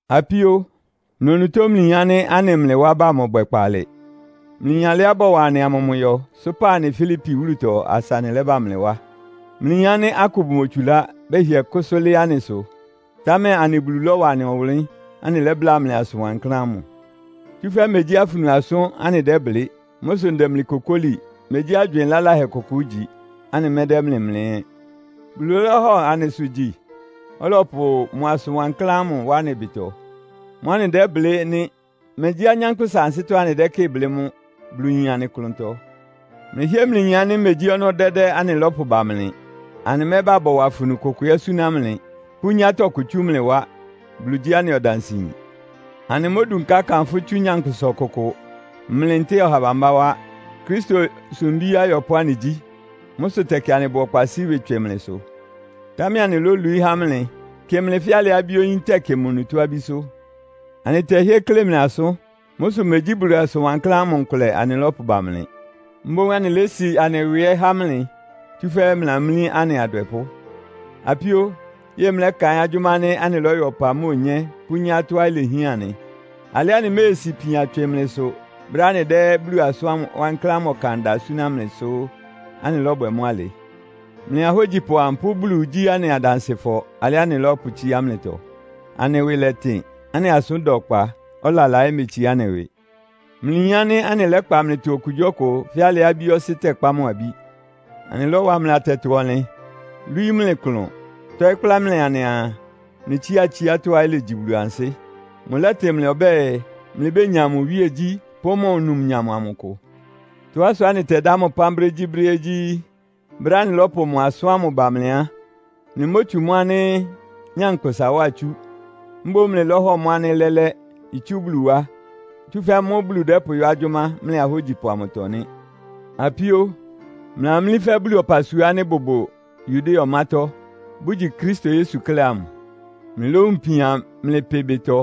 Apíó, mlɩ onutó mlɩyin ánɩ́ anɩ mlɩ wá bá mɔbwɛ kpaalɩ. Mlɩyin alɩá bɔwa anɩ amʋmʋyɔ, sʋ́pa anɩ Filipi wúlutɔ asa anɩlɛ́bá mlɩ wá. Mlɩyin ánɩ́ akʋ bʋmotsulá, bɛhɩɛ kʋ́sʋ́ lɩ́ɩ́ anɩsʋ; támɛ anɩ Bulu lɔ́wa anɩ ɔwʋnlɩ́n, anɩlɛ́bláa mlɩ asʋn wankláán ámʋ. Tsúfɛ́ megyí afunu asʋ́n anɩdɛ́blɩ́. Mʋ́ sʋ ndɛ mlɩ kokóli. Megyí agywɩɩn laláhɛ kʋkʋ ígyi, anɩmɛ́dɛ́ mlɩ mlɛ́ ɛ́. Bulu lɔ́hɔ anɩsʋ gyi, ɔlɔpʋ mʋ asʋn wankláán ámʋ wá anɩ ɩbɩtɔ. Mʋ́ anɩdɛ́blɩ́ nɩ́! Megyí anyánkpʋ́sa ansɩ́tɔ́ anɩdɛ́kɩ́ɩ blɩ́ mʋ́, Bulu yin anɩ klʋntɔ. Mlɩhɩ́ɛ́ mlɩyin ánɩ́ megyí ɔnɔ́ dɛ́dɛ́ anɩlɔ́pʋ ba mlɩ. Anɩmɛ́ba bɔwa afunu kʋkʋ ɛ́ súná mlɩ, pʋ́nyá tɔkʋ tsú mlɩ wá. Bulu gyí anɩ ɔdansɩyin. Anɩmódunká kanfʋ́ tsú nyankpʋsa ɔkʋkʋ, mlɩ, ntɛ́ɛ ɔha bambá wá. Kristo sumbí ayɔpʋ́ anɩgyí. Mʋ́ sʋ tɛkɩ anɩbʋ ɔkpa sɩ́ ɩwɩ tswɩ mlɩsʋ, támɛ anɩlólwií há mlɩ, kɩ mlɩ fɛ́ alɩá abí-oyín tɛkɩ mʋ onutó abísʋ́. Anɩtɛhɩ́ɛ́ klé mlɩ asʋ́n. Mʋ́ sʋ megyí Bulu asʋn wankláán ámʋ nkʋlɛ anɩlɔ́pʋ ba mlɩ, mboún anɩlési anɩ ɩwɩ ɛ́ há mlɩ, tsúfɛ́ mlɩlamlí anɩ adwɛpʋ́. Apíó, yɛ́ɛ mlɛ́kaɩ́n agyʋ́má ánɩ́ anɩlɔ́yɔ ɔpa mʋ́a onyé pʋ́nyá tɔ́á ilehián anɩ? Alɩá anɩméesi ipian tswɩ mlɩsʋ brɛ́á anɩdɛ́ Bulu asʋn wankláán ámʋ ɔkan da súná mlɩ sʋ́ anɩlɔ́bwɛ mʋ́ alɩ. Mlɩ ahógyipʋ amʋ pʋ́ Bulu gyí anɩ adansɩfɔ alɩá anɩlɔ́pʋtsíá mlɩtɔ. Anɩ ɩwɩ lɛtɩn, anɩ asʋ́n da ɔkpa, ɔlala ɛ́ metsiá anɩ ɩwɩ. Mlɩyin ánɩ́ anɩlɛ́kpa mlɩtɔ okugyíɔkʋ fɛ́ alɩá abí-ɔsɩ́ tɛkpá mʋ abí. Anɩlɔ́wa mlɩ atɛtɔ-ɔnlɩn, lwíí mlɩ klʋn, tɔ́ɩ́ kplá mlɩ anɩaa, mlɩtsía tsiátɔ́á ilegyi Bulu ansɩ́. Mʋlɛ́tɩ mlɩ ɔbɛ́ɛ, mlɩbénya mʋ iwíegyí pʋ́ mʋ numnyam amʋ ɩkʋ. Tɔ́á sʋá anɩtɛdá mʋ ɩpán brégyíbrɛ́ ɛ́ gyí, brɛ́á anɩlɔ́pʋ mʋ asʋ́n ámʋ ba mlɩ á, mlɩmótsu mʋ́ ánɩ́ nyankpʋsa wá itsú. Mboún mlɩlɔ́hɔ mʋ́ ánɩ́ lɛ́lɛ́, itsú Bulu wá; tsúfɛ́ mʋ́ Bulu dɛ́pʋyɔ́ agyʋ́má mlɩ ahógyipʋ amʋtɔ nɩ́. Apíó, mlɩlamlí fɛ́ Bulu ɔpasua ánɩ́ ɩbʋbʋ Yudea ɔmátɔ́, bʋgyi Kristo Yesu klɛ́ amʋ. Mlɩlówun ipian mlɩ pɩ ɩbɩtɔ,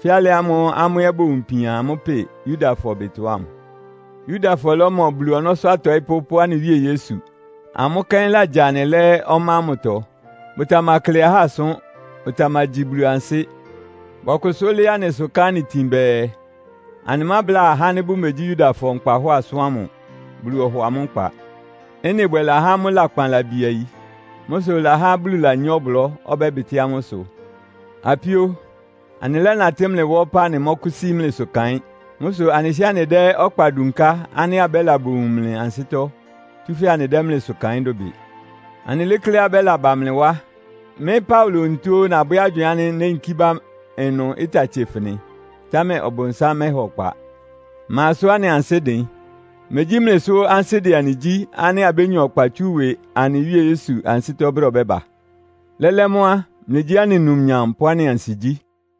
fɛ́ alɩ ámʋ́ʋ́ amʋ́ ɛ́ bowun ipian amʋ́ pɩ Yudafɔ ɩbɩtɔ ámʋ. Yudafɔ lɔ́mɔ Bulu ɔnɔ́sʋ́ atɔɩ́pʋ́ pʋ́ anɩ Wíe Yesu. Amʋ́ kɛ́n lagya anɩ lɛ́ ɔmá ámʋtɔ. Bʋtamakle ahá asʋ́n, bʋtamagyi Bulu ansɩ́. Bɔkʋsʋ́ lɩ́ɩ́ anɩsʋ ká anɩ itin bɛɛ, anɩmábla ahá ánɩ́ bʋmegyí Yudafɔ nkpahɔ́ɔ asʋ́n ámʋ, Bulu ɔhɔ amʋ́ nkpa. Ɩ́nɩ bwɛ lahá amʋ́ lakpan labiayi. Mʋ́ sʋ ɩlahá Bulu lanyá ɔblɔ́, ɔbɛ́bɩtɩ́ amʋ́ ɩsʋ. Apíó, anɩlɛ́natɩ́ mlɩ wá ɔpá anɩmɔ́kʋ́sí mlɩsʋ kaɩ́n. Mʋ́ sʋ anɩhɩ́ɛ́ anɩdɛ́ ɔkpa dunká ánɩ́ abɛ́la bowun mlɩ ansɩ́tɔ́, tsúfɛ́ anɩdɛ́ mlɩsʋ kaɩ́n dʋbɩ. Anɩlékléá abɛ́laba mlɩ wá. Mɩ́ Paulo onutó ó nabwɛ́ agywɩɩn ánɩ́ néyinkí bá ɩnʋ ɩta tsefɩnɩ, támɛ Ɔbʋnsám mɛ́ha ɔkpa. Ma sʋ́ anɩ ansɩ́ dɩn? Megyí mlɩ sʋ ansɩ́ dɛ anɩ gyí ánɩ́ abénya ɔkpa tsú ɩwɩ anɩ Wíe Yesu ansɩ́tɔ́ brɛ́á ɔbɛ́ba? Lɛ́lɛ́ mʋ́ á, mlɩgyí anɩ numnyam pʋ́ anɩ ansigyí.